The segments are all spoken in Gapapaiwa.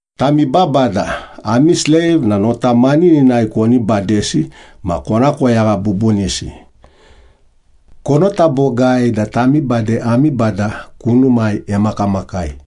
Tami babada, ami sleiv na nota manininai koni badesi ma kona koyagha bubunisi. Konota bogai da tami bade ami Bada kunumai emakamakai.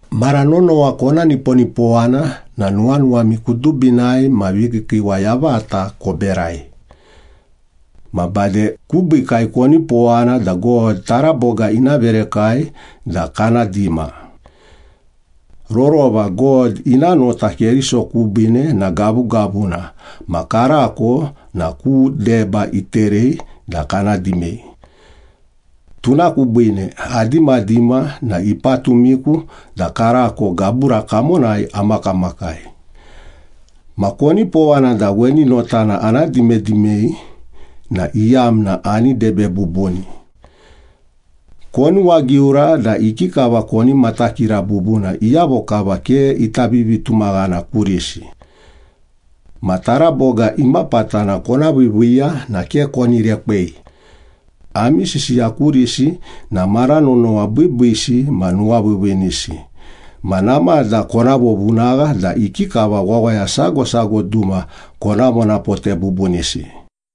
Mara nonowa kona niponipowana na nuwanuwami kudubinai ma vikiikiiwa yavata koberai. Ma bade kubiikai konipowana da God taraboga ina verekai da kana dima. Rorova God ina nota Keriso kubiine na gavugavuna ma karako na ku deba iterei da kana dimei. Tuna kubiine adimadima na ipatumiku da karako gabura kamonai amakamakai. Ma konipowana da weni notana ana dimadimei na iyamna ani debe bubuni. Konuwagiura da ikikava koni matakira bubuna iyavo kava ke ita vivitumaghana kurisi. Ma taraboga imapatana kona viiviiya na ke koni rekwei. Ami sisiya kurisi na mara nonowa biibiisi ma nuwaviiviinisi, ma namada kona vovunagha da ikikava wawaya sago sago duma kona vonapote bubunisi.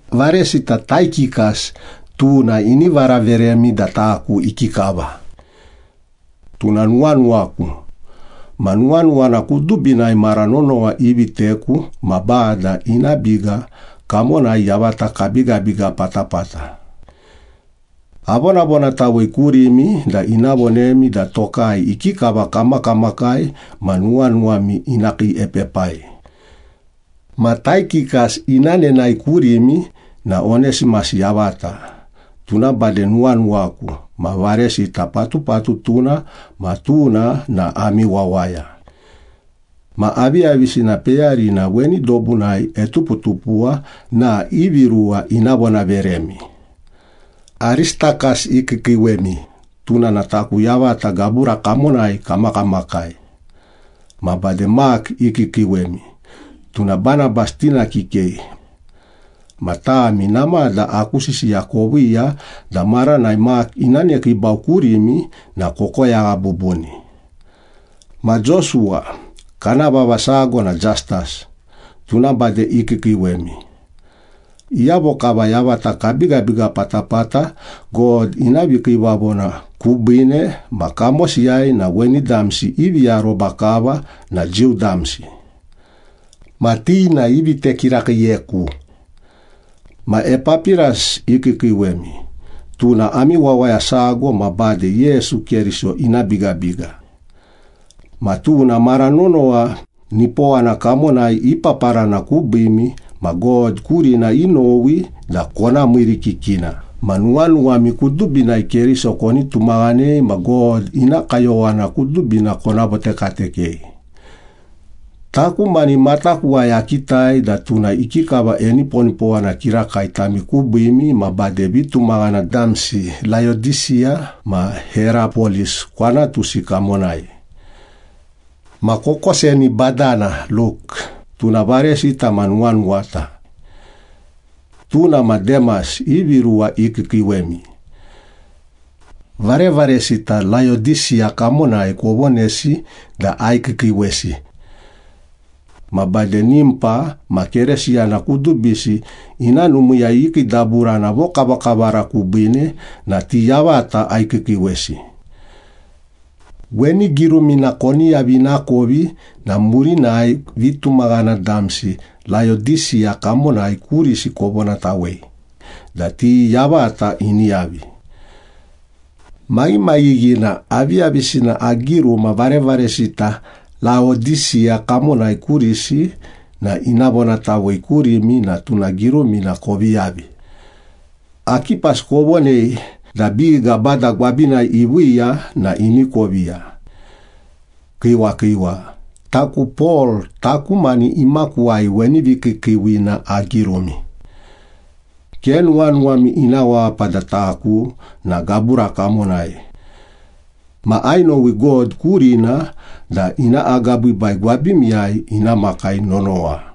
Varesita Taikikas, tuna ini varaveremi da taku ikikava. Tuna nuwanuwaku, ma nuwanuwana kudubinai mara nonowa iviteku ma Bada ina biga kamonai yavata kabigabiga patapata. Avonavonatawei kurimi da ina vonemi da tokai ikikava kamakamakai ma nuwanuwami ina kiiepepai. Ma Taikikas ina nenae kurimi na Onesimas yavata, tuna bade nuwanuwaku ma varesita patupatutuna, ma tuna na ami wawaya. Ma aviyavisina peyarina weni dobunai etuputupuwa na ivi ruwa ina vonaveremi. Aristakas ikiikiiwemi, tuna na taku yavata gabura kamonai kamakamakai. Ma bade Mak ikiikiiwemi, tuna Banabas tina kikei. Ma tami namada aku sisiya koviiya da maranai Mak ina nekiibau kurimi na kokoyagha bubuni. Ma Josuwa, kana vava sago na Jastas, tuna bade ikiikiiwemi. Iyavo kava yavata kabigabiga patapata God ina vikiivavona kubiine ma kamosiyai na weni damsi ivi aroba kava na Jiu damsi. Ma ti na ivite kirakiiyeku. Ma Epapiras ikiikiiwemi, tuna ami wawaya sago, ma bade Yesu Keriso ina bigabiga. Ma tuna mara nonowa nipowana kamonai ipaparana kubiimi ma God kurina inowi da kona miirikikina ma nuwanuwami kudubinai Keriso koni tumaghanei ma God ina kayowana kudubina kona votekatekei. Taku mani matakuwai akitai da tuna ikikava eniponipowana kirakai tami kubiimi ma bade vitumaghana damsi Laodisiya ma Herapolis kwanatusi kamonai. Ma kokoseni badana Luk, tuna varesita ma nuwanuwata. Tuna ma Demas ivi ruwa ikiikiiwemi. Varevaresita Laodisiya kamonai kovonesi da aikiikiiwesi. Ma bade Nimpa ma Keresiyana kudubisi ina numiiyai ikiidaburana vokavakavara kubiine na ti yavata aikiikiiwesi. Weni girumina koni yavi ina kovi na murinai vitumaghana damsi Laodisiya kamonai kurisi kovonatawei da ti yavata ini yavi. Maghimaghighina, aviyavisina agiruma varevaresita Laodisiya kamonai kurisi na ina vonatawei kurimi na tuna girumina kovi yavi. Akipas kovonei da biga Bada gwabinai iviiya na ini koviya. Kiiwa kiiwa. Taku Pol taku mani imakuwai weni vikiikiiwina agirumi. Ke nuwanuwami ina wapa da taku na gabura kamonai. Ma ainowi God kurina da ina agabiibai gwabimiyai ina makai nonowa.